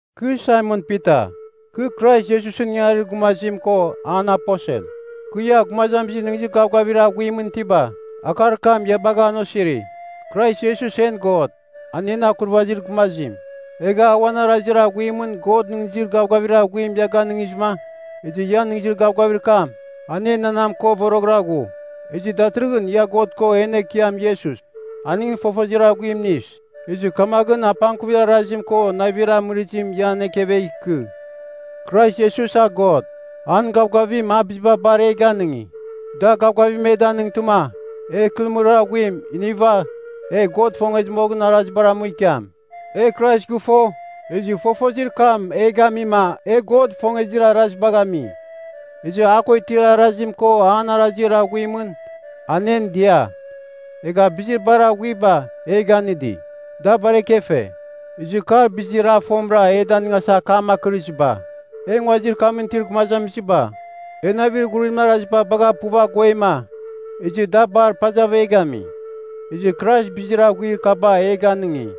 Kɨ Saimon Pita, kɨ Krais Iesusɨn ingangarir gumazim ko an aposel. Kɨ, ia gumazamizir nɨghnɨzir gavgavir aghuimɨn itiba, akar kam ia bagha an osiri. Krais Iesus en God, a en Akurvazir Gumazim. Egha a uan arazir aghuimɨn God nɨghnɨzir gavgavir aghuim ia ganɨngizɨma, ezɨ ian nɨghnɨzir gavgavir kam, an enanam ko voroghɨra ghu. Ezɨ datɨrɨghɨn ia God ko en Ekiam Iesus, aningɨn fofozir aghuim inis. Ezɨ kamaghɨn apangkuvir arazim ko navir amɨrɨzim ian ekevegh ikɨ. Krais Iesus a God, an gavgavim a biziba bar e ganɨngi, da gavgavim e danɨngtɨma, e ikɨrɨmɨrir aghuim iniva e God ifongezir arazibar amu ikiam. E Krais gɨfo, ezɨ fofozir kam e gamima e God ifongezir arazibagh ami. Ezɨ a ko itir arazim ko an arazir aghuimɨn, an en dia. Egha bizir bar aghuiba e ganɨngi, da bar ekefe. Ezɨ kar bizir a fomɨra e danɨngasa akam akɨrizɨba. E nguazir kamɨn itir gumazamiziba, e navir ghurimɨn araziba bagha puv aguema, ezɨ da bar pazav e gami. Ezɨ Krais bizir aghuir kaba bar e ganɨngi,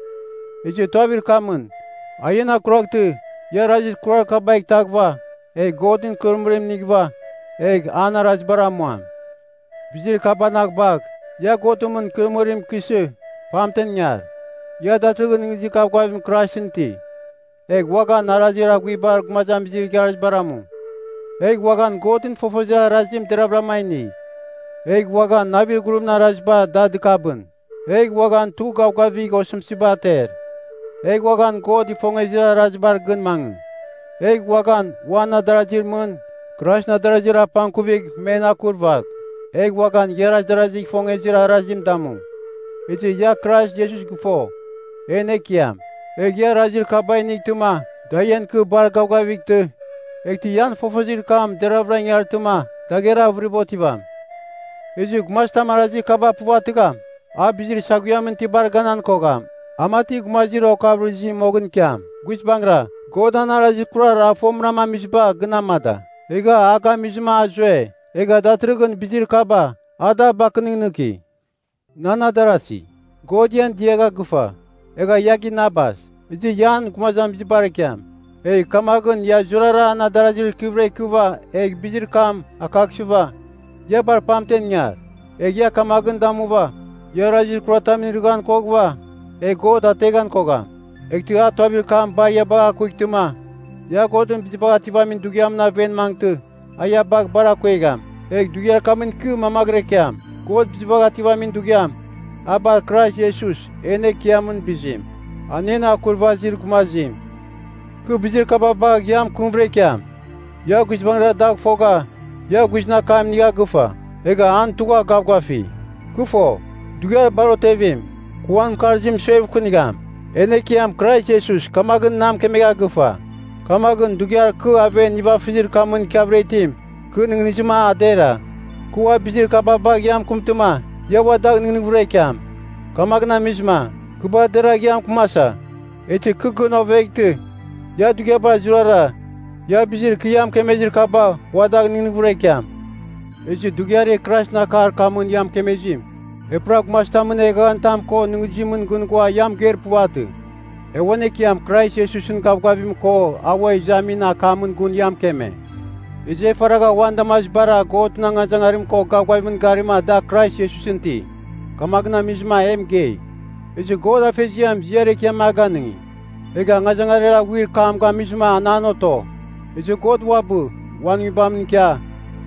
ezɨ tuavir kamɨn, a ian akuraghtɨ, ia arazir kurar kabagh itaghɨva, egh Godɨn ikɨrɨmɨrim inighɨva egh an arazibar amuam. Bizir kabanang bagh, ia Godɨn mɨn ikɨrɨmɨrim ikɨsɨ pamten ingar. Ia datɨrɨghɨn nɨghnɨzir gavgavim Kraisɨn iti. Egh uaghan arazir aghuibar gumazamizir igharazibar amu, egh uaghan Godɨn fofozir arazim deravɨra a inigh. Egh uaghan navir ghurimɨn araziba da dɨkabɨn, egh uaghan tugh gavgavigh osɨmtɨziba ater, egh uaghan God ifongezir arazibar gɨn mangɨ. Egh uaghan, uan adarazir mɨn, Kraisɨn adarazir apangkuvigh men akurvagh. Egh uaghan igharaz darazigh ifongezir arazim damu. Ezɨ ia Krais Iesus gɨfo, en Ekiam. Egh ia arazir kaba inightɨma da ian ikɨ bar gavgavightɨ, eghtɨ ian fofozir kam deravɨra ingartɨma, dagher avɨriba otivam. Ezɨ gumazitam arazir kaba puvatɨgham, a bizir saghuiamɨn tibar ganan kogham, a mati gumazir okavɨrɨzim moghɨn ikiam. Guizbangɨra, God an arazir kurar a fomɨra amiziba gɨn amada, egha a gamizɨma a zue. Egha datɨrɨghɨn bizir kaba, a da bakɨnɨghnɨki. Nan adarasi, God ian diagha gɨfa, egha ia ginabas, ezɨ ia an gumazamizibar ikiam. Egh kamaghɨn ia zurara an adarazir ikɨvɨra ikɨva egh bizir kam akaghsɨva, ia bar pamtem ingar. Egh ia kamaghɨn damuva, ia arazir kuratamɨn irɨghan koghɨva, egh God ateghan kogham. Eghtɨ a tuavir kam bar ia bagh a kuightɨma ia God Bizibagh Ativamin Dughiamɨn aven mangɨtɨ a ia bagh bar akuegham. Egh dughiar kamɨn ikɨ mamaghɨra ikiam. God Bizibagh Ativamin Dughiam, a bar Krais Iesus en Ekiamɨn bizim, a en Akurvazir Gumazim. Kɨ bizir kaba bagh ia mɨkɨmvɨra ikiam. Ia guizbangɨra dagh fogha ia guizɨn akam inigha gɨfa, egha an tugha gavgafi. Kɨ fo, dughiar bar otevim, kɨ uan mɨkarzim suevkɨnigham. En Ekiam Krais Iesus kamaghɨn na mɨkemegha gɨfa. Kamaghɨn dughiar kɨ aven nivafɨzir kamɨn ikiavɨra itim, kɨ nɨghnɨzima a dera, kɨ ua bizir kaba bagh ia mɨkɨmtɨma, ia ua dagh nɨghnɨghvɨra ikiam. Kamaghɨn amizɨma, kɨ bar deragh ia mɨkɨmasa. Eghtɨ kɨ gɨn oveghtɨ, ia dughiabar zurara ia bizir kɨ ia mɨkemezir kabagh ua dagh nɨghnɨghvɨra ikiam. Ezɨ dughiar e Kraisɨn akar kamɨn ia mɨkemezim, e pura gumazitamɨn eghaghanitam ko nɨghnɨzimɨn gɨn ghua ia mɨgeir puvatɨ. E uan Ekiam Krais Iesusɨn gavgavim ko a ua izamin akamɨn gun ia mɨkeme. Ezɨ e faragha uan damazibara Godɨn angazangarim ko gavgavimɨn garima da Krais Iesusɨn iti, kamaghɨn amizɨma e mɨgei. Ezɨ God Afeziam ziar ekiam a ganɨngi, egha angazangarir aghuir kam gamizɨma an an oto. Ezɨ God uabɨ uan Nguibamɨn ikia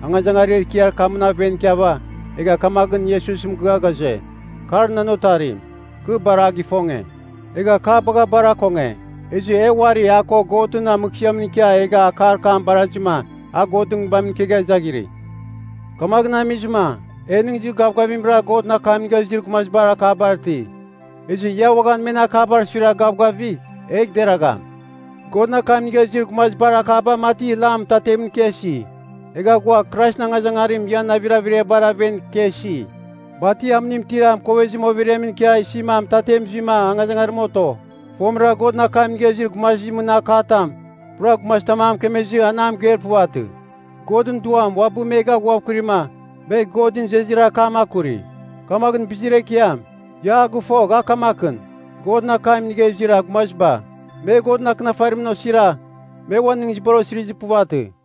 angazangarir ekiar kamɨn aven ikiava egha kamaghɨn Iesus mɨgɨa ghaze, “Kar nan Otarim, kɨ bar a gifonge, egha kɨ a bagha bar akonge.” Ezɨ e uari a ko Godɨn mɨghsɨamɨn ikia egha akar kam barazima a Godɨn Nguibamɨn ikegha zaghirɨ. Kamaghɨn amizɨma e nɨghnɨzir gavgavimra Godɨn akam inigha izir gumazibar akabar iti. Ezɨ ia uaghan men akabar suiragh gavgavigh, egh deragham. Godɨn akam inigha izir gumazibar akaba mati lam mɨtatemɨn ikia isi. Egha ghua Kraisɨn angazangarim ian navir averiabar aven ikia isi, mati amɨnim itir mɨkovezim overiamɨn ikia isima mɨtatem zuima angazangarim oto. Fomɨra Godɨn akam inigha izir gumazimɨn akatam, pura gumazitam a mɨkemezɨ an a mɨgeir puvatɨ. Godɨn Duam uabɨ me gaghuavkɨrima me Godɨn izezir akam akuri. Kamaghɨn bizir ekiam, ia a gɨfogh a kamakɨn, Godɨn akam inigha izir gumaziba, me Godɨn Akɨnafarimɨn osira me uan nɨghnɨzibar osirizir puvatɨ.